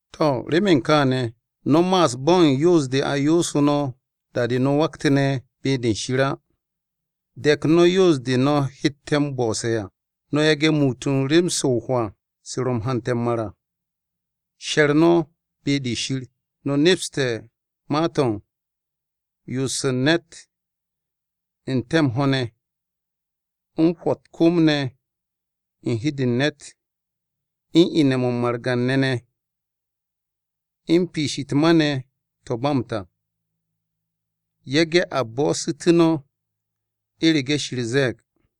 To̱ remen kaane̱, no̱ ma'as bo̱ u̱n yoos-de a yoosu̱ no̱ da-de no̱ waktu̱ne̱ be-de Shir á. De̱k no̱ yoos-de no̱ hette̱ m-bo̱'o̱se̱ à. No̱ yage̱ muut u̱n rem-se o-hwaa se ro̱ u̱n hante̱ m-mar à, She̱r no̱ be-de Shir. No̱ nepste̱ ma-to̱ u̱n: Yo'os u̱n ne̱t n-te̱ m-ho̱ ne̱, u̱n Hwo̱ u̱t-kom ne̱ u̱n hi-de u̱n ne̱t, u̱n Ine̱-mo̱ margan-ne̱ ne̱, u̱n Piish u̱t-ma ne̱ to̱ ba m-ta. Yage̱ a bo'osu̱tu̱ no̱, u̱rege̱ Shir ze̱e̱g.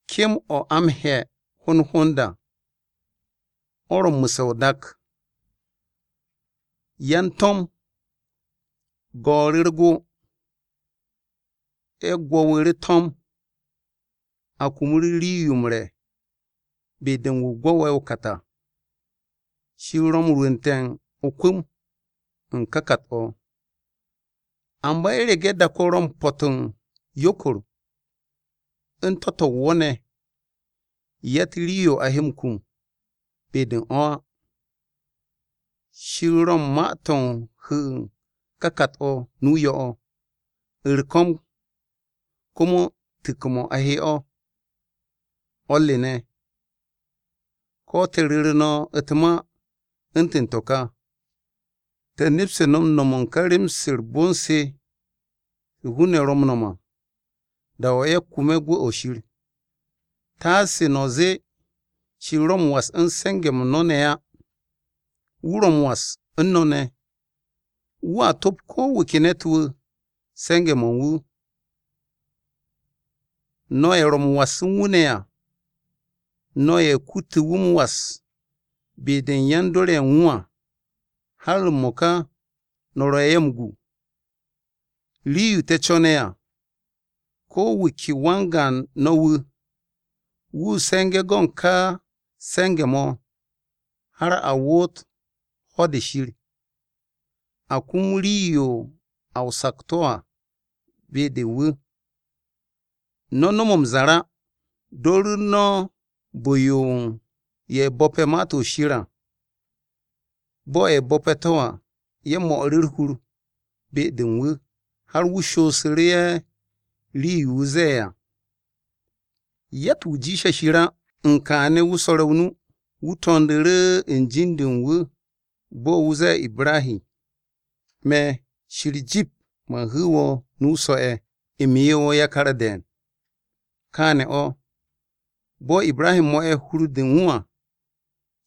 Kem-o̱ a m-he̱ hond hond à, o̱ ro̱ m-mu̱se̱ o-dak, yan-to̱m go̱o̱ru̱ u̱r-go. Ye̱ gwo̱wu̱ru̱ to̱m, a kumu̱ru̱ rii-yo m-re̱ be-de u̱n wu̱ gwo̱we̱ o-kat à. Shir ro̱ m-rwu̱nte̱ o-kwu̱m u̱n ka kat-o̱. Amba u̱rege̱ dak-o ro̱ m-po̱t u̱n yokor u̱n to̱-to̱ u̱n wo̱ ne̱, yatt rii-yo o he m-kum be-de u̱n o̱ á. Shir ro̱ u̱n ma-to̱ u̱n hu̱u̱ ka kat-o̱ nu-o yo̱-o̱. U̱r-ko̱m, komo tu̱ks-mo̱ a he o̱. O̱r re ne̱, ko̱ te̱ ru̱ru̱ no̱ u̱t-ma u̱ntu̱n to̱ kà, te̱ nepste̱ no̱ m-no̱m u̱n ka rem-se u̱r-bon se hun-ne̱ ro̱ m-no̱m à da-o̱ ye̱ kume̱ gwu̱-o̱ Shir. Taase no̱ zee Shir ro̱ m-was u̱n se̱nge̱-m no̱ ne̱ á. Wu̱ ro̱ m-was u̱n mo̱ ne̱. Wu̱a top ko̱ wu̱ ke ne̱t-wu̱ se̱nge̱-mo̱ u̱n wu̱. No̱ ye̱ ro̱ m-was u̱n wu̱ ne̱ à, no̱ ye̱ kutu̱ wu̱ m-was be-de u̱n yan-dor ye̱ u̱n wu̱ à. Har m-mo̱ka no̱ ro̱ ye̱ m-gu. Rii-yo te̱ co̱ne̱ à, ko̱ wu̱ ke wan-gaan no̱ wu̱, wu̱ se̱nge̱ go̱ u̱n ká se̱nge̱-mo̱ har a woot ho̱-de Shir. A kum rii-yo a o-sakto̱ à be-de wu̱. No̱ no̱m m-zar á. Do̱ru̱ no̱ bu̱-yo u̱n ye̱ bo̱pe̱ Ma-to̱ Shir à. Bo̱ ye̱ bo̱pe̱ to̱ à, ye̱ mo̱'u̱ru̱ u̱r-hur be-de u̱n wu̱, har wu̱ shoosu̱ru̱ ye̱ rii-yo wu̱ zee ye̱ à. Yatt-wu̱ jiishe̱ Shir á, u̱n kaane̱ wu̱ swo̱re̱ o-nu u̱n Ibrahi. Wu̱ to̱ndu̱ru̱ u̱n jin-de u̱n wu̱, bo̱ wu̱ zee Ibrahi, “Me̱, Shir, jip man hu̱u̱ wo̱ nu so̱-ye̱. U̱m 'ye wo̱ yakar de̱e̱n.” Kaane̱ o̱, bo̱ Ibrahi mo̱'e̱ hur-de u̱n wu̱ à,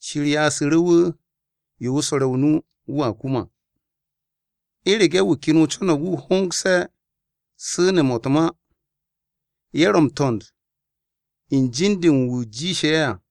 Shir ya'asu̱ru̱ wu̱ yo wu̱ swo̱re̱ o-nu wu̱a kum à. U̱rege̱ wu̱ ken co̱no̱g wu̱ hongse̱ su̱ne̱-mo̱ u̱t-ma, ye̱ ro̱ m-to̱nd u̱n jin-de u̱n wu̱ jiishe̱ ye̱ à.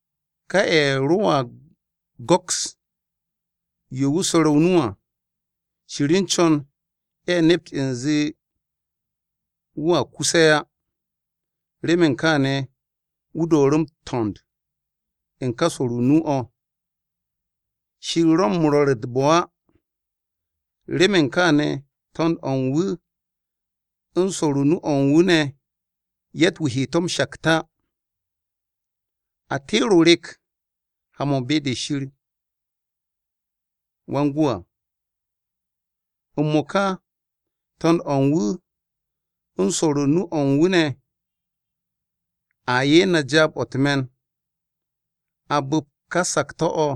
Ka ye̱ roa go̱ks yo wu̱ swo̱re̱ o-nu à, Shir u̱n co̱n ye̱ nept u̱nze wu̱ à kuse̱ á, remen kaane̱ wu̱ do̱o̱ru̱ m-to̱nd u̱n ka swo̱'ru̱ nu-o̱. Shir ro̱ m-rwo̱r u̱t-bo̱ á! Remen kaane̱ to̱nd-o̱ u̱n wu̱ u̱n swo̱o̱ru̱ nu-o̱ u̱n wu̱ ne̱ yatt-wu̱ he to̱ m-shakt á. A teere̱ o-rek ha-mo̱ be-de Shir Wan-Gwu̱ à. M-mo̱ka to̱nd-o̱ u̱n wu̱ u̱n swo̱o̱ru̱ nu-o̱ u̱n wu̱ ne̱, a 'ye na jaab-o̱ u̱t-me̱n a bu̱pt ka sakto̱-o̱,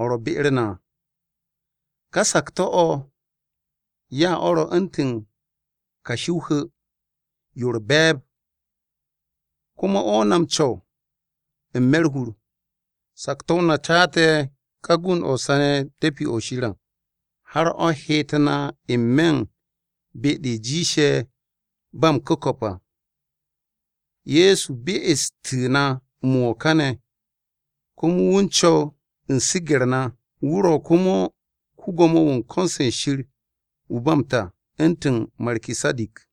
o̱ ro̱ be-u̱r na à. Ka sakto̱-o̱ ya o̱ ro̱ u̱ntu̱n kashi o-hu̱, yo u̱r-be̱e̱b, komo o̱ na m-co̱w n-me̱ u̱r-hur. Sakto̱-o na caate̱ ka gund-o̱ sane̱ de̱pi-o̱ Shir à, har o̱ heet na n-me̱ u̱n be-de jiishe̱ ba m-ku̱ko̱p à. Ye̱so be'estu̱ na m-wo̱ kane̱, komo wu̱ u̱n co̱w u̱n su̱ge̱-u̱r na. Wu̱ ro̱ komo ko-Gwo̱mo-wu̱ u̱n ko̱n-se Shir wu̱ u̱n ba m-ta u̱ntu̱n Markisadik.